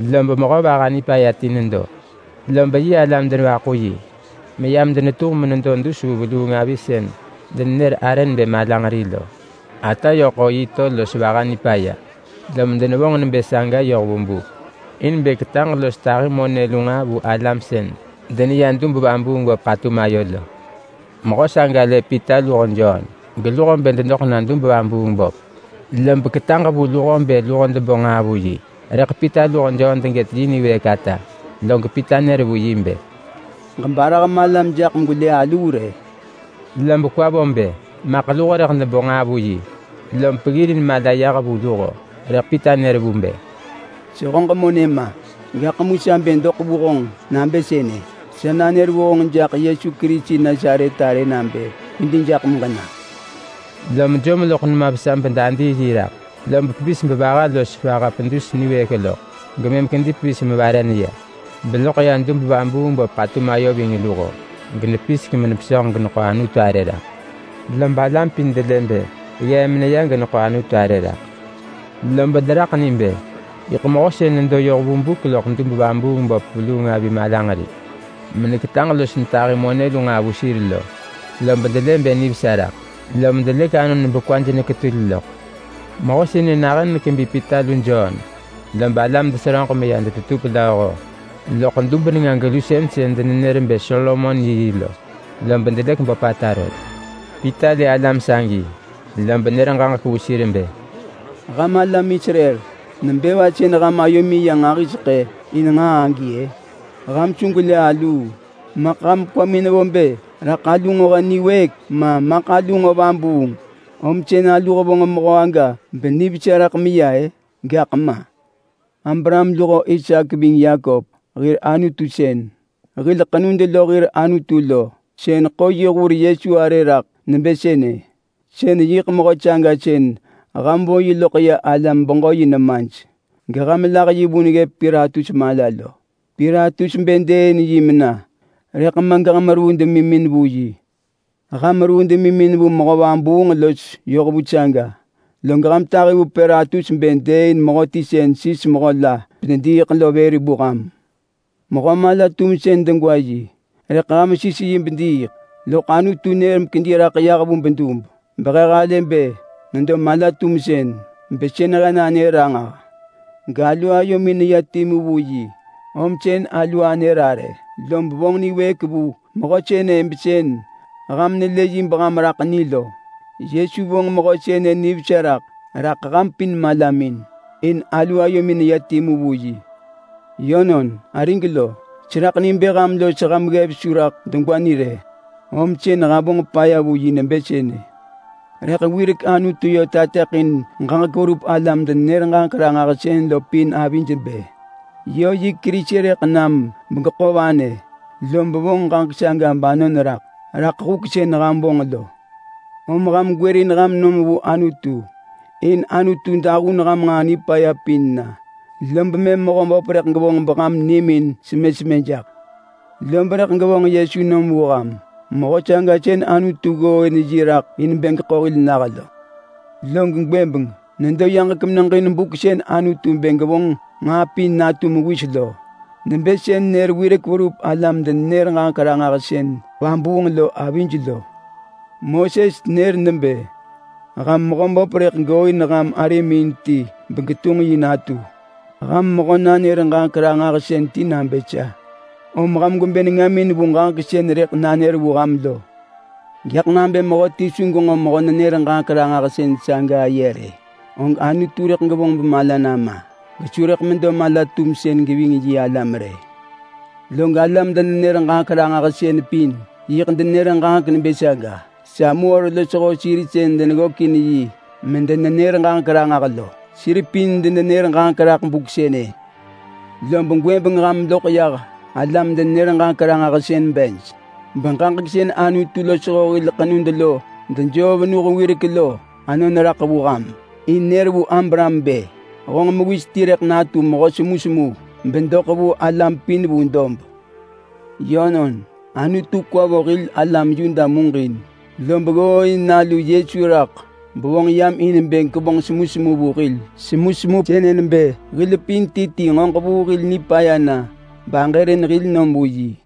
Lob mehö vaha nipaya ti nedo, lob yi alam denevaḳu yi meyam denetunġ menedo dus vu veluung avi sën denenër arë nebë Malanġeri lo. Ata yö ḳo yi to los vaha nipaya, lom denevonġ nebë saga yoh vu buk in bë ketaġ los tahi monë lu nġaa vu alam sën deneya dub-vabuung-böp ḳatum ayo lo. Mehö saga lë Pita luho Jon geluho bë dedoḳ na dub-vabuung-böp, lob ketaġ vu luho bë luho debo nġaa vu yi. Rëḳ Pita luho Jon degët yi niwëëk ata, log Pita nër vu yi bë, “Ġebarah malam jaḳ megwelë aluu rë!” Lob kwa vo bë maḳ luho rëḳ debo nġaa vu yi, lom peggirin mala yah vu luho. Rëḳ Pita nër bë, “Sehöġ monë ma! Gaḳ mu sa bë doḳ vu honġ nabë sënë: Sa nanër vu honġ jaḳ Yesu Kerisi Nasaret arë nabë, ‘Kwedi jaḳ meġena!’” Lom jom loḳ nema vesa bedadii yi raḳ. Lob pevis bevaha los vaha pedus niwëëk loḳ, gemëm kedi pevis mevare neya. Beloḳ ya dub-vabuung-böp ḳatum ayo ving luho, genepisek menepesönġ geneḳo Anutu arë raḳ. Lob alam pin delë bë ggee meneya geneḳo Anutu arë raḳ. Lob deraḳ ni bë yiḳ mehö sën nedo yoh vu buk loḳ dub-vabuung-böp veluung avi Malanġeri, meneketaġ los netahi monë lu nġaa vu sir lo. Lob delë bë nivesa raḳ lom delëk anon bekwaj neketul loḳ. Mehö sënë nahën nekebi Pita lu Jon, lob alam deseröġ meya detetup lööho loḳ dub nenga-gelusën sën denenër bë Solomon yiyi lo, lob delëk böpata rot. Pita lë alam sagi lob nër ġaġek vu sir bë, “Ham alam Israel! Nebë va sën ham ayomin ya nġahiseḳë in nġaa agi-ë? Ham su gwelë aluu! Maḳ ham kwamin nevo bë raḳ alu nġo he niwëëk ma maḳ alu nġo vabuung om sën alu hevonġ mehö aga benivesa raḳ meneya-ë? Gaḳ ma! Abraham luho Isaak ving Yakop hir Anutu sën, hil ḳenud lo hir Anutu lo, sën ḳo yi hur Yesu arë raḳ nebë sënë. Sën yiḳ mehö saga sën ham vo yi loḳ ya alam-beġö-yi nemaj, geham lah yi vun ggëp Pilatus mala lo. Pilatus bë dëëin yi mena, rëḳ ma geham ruu demimin vu yi! Ham ruu demimin vu mehö vabuung los yohvu saga, log ham tahi vu Pilatus bë dëëin mehöti sën sis mehö la bedediiḳ lo vër vu ham. Mehö mala-tumsën degwa yi rëḳ ham sis yi bediiḳ. Loḳ Anutu nër mekedi raḳ yah vu bedub, behe halë bë nedo mala-tumsën, besën he nanër ranġah. Galu ayomin neya timu vu yi, om sën alu anër arë, lob vonġ niwëëk vu mehö sënë besën ham nelë yi beham raḳ ni lo. Yesu vonġ mehö sënë nivesa raḳ raḳ ham pin malamin in alu ayomin neya timu vu yi. Yönon, arig lo! Seraḳ ni bë ham los ham ggev su raḳ degwa ni rë, om sën ham vonġ paya vu yi nebë sënë. Rëḳ wirek Anutu yö tateḳin ġaġek verup alam-denenër-ġaġek-ranġahsën lo pin avij nebë yö yi Kerisi rëḳ nam begeḳo vanë. Lob vonġ ġaġek saga banon raḳ raḳ huk sën ham vonġ lo. Om ham gwërin ham nom vu Anutu in Anutu dahun ham nġaa nipaya pin na, lob mëm Mehöböp rëḳ gevonġ beham nimin semë semë jaḳ. Lob rëḳ gevonġ Yesu nom vu ham. Mehö saga sën Anutu ggooin raḳ in bë geḳo hil nah lo. Log gwëbeng nedo yaġek meneġin buk sën Anutu bë gevonġ nġaa pin natu mewis lo. Nebë sën nër wirek verup alam-denenër-ġaġek-ranġahsën vabuung lo avij lo. Moses nër nebë, ‘Ham Mehöböp rëḳ gooin ham arimin ti begetunġ yi natu ham mehö-nanër-ġaġek-ranġahsën ti nabë sa. Om ham gwebë nengamin vu ġaġek sën rëḳ nanër vu ham lo. Gaḳ nabë mehöti su genġo mehö-nenër-ġaġek-ranġahsën saga aye rë, og Anutu rëḳ gevonġ bemala nama, gesu rëḳ medo mala-tumsën geving yi alam rë.’ Log alam-denenër-ġaġek-ranġahsën pin yiḳ denenër ġaġek nebë saga. Samuel losho alam sën deneverup ggökin yi medenenër ġaġek ranġah lo, sir pin denenër ġaġek raḳ buk sënë. Lob gwëbeng ham loḳ yah alam-denenër-ġaġek-ranġahsën bej, beġaġek sën Anutu losho hil ḳenud lo dejoo venuh wirek lo anon raḳ vu ham, in nër vu Abraham bë, ‘Honġ mewis ti rëḳ natu mehö semusemu bedoḳ vu alam pin vu dob.’ Yönon, Anutu kwa vo hil alam Yuda muġin, lob ggooin nalu Yesu raḳ bevonġ yam in bë gevonġ semusemu vu hil. Log semusemu sënë nebë hil pin ti ti nġo ġevuu hil nipaya na baġërin hil nom vu yi.”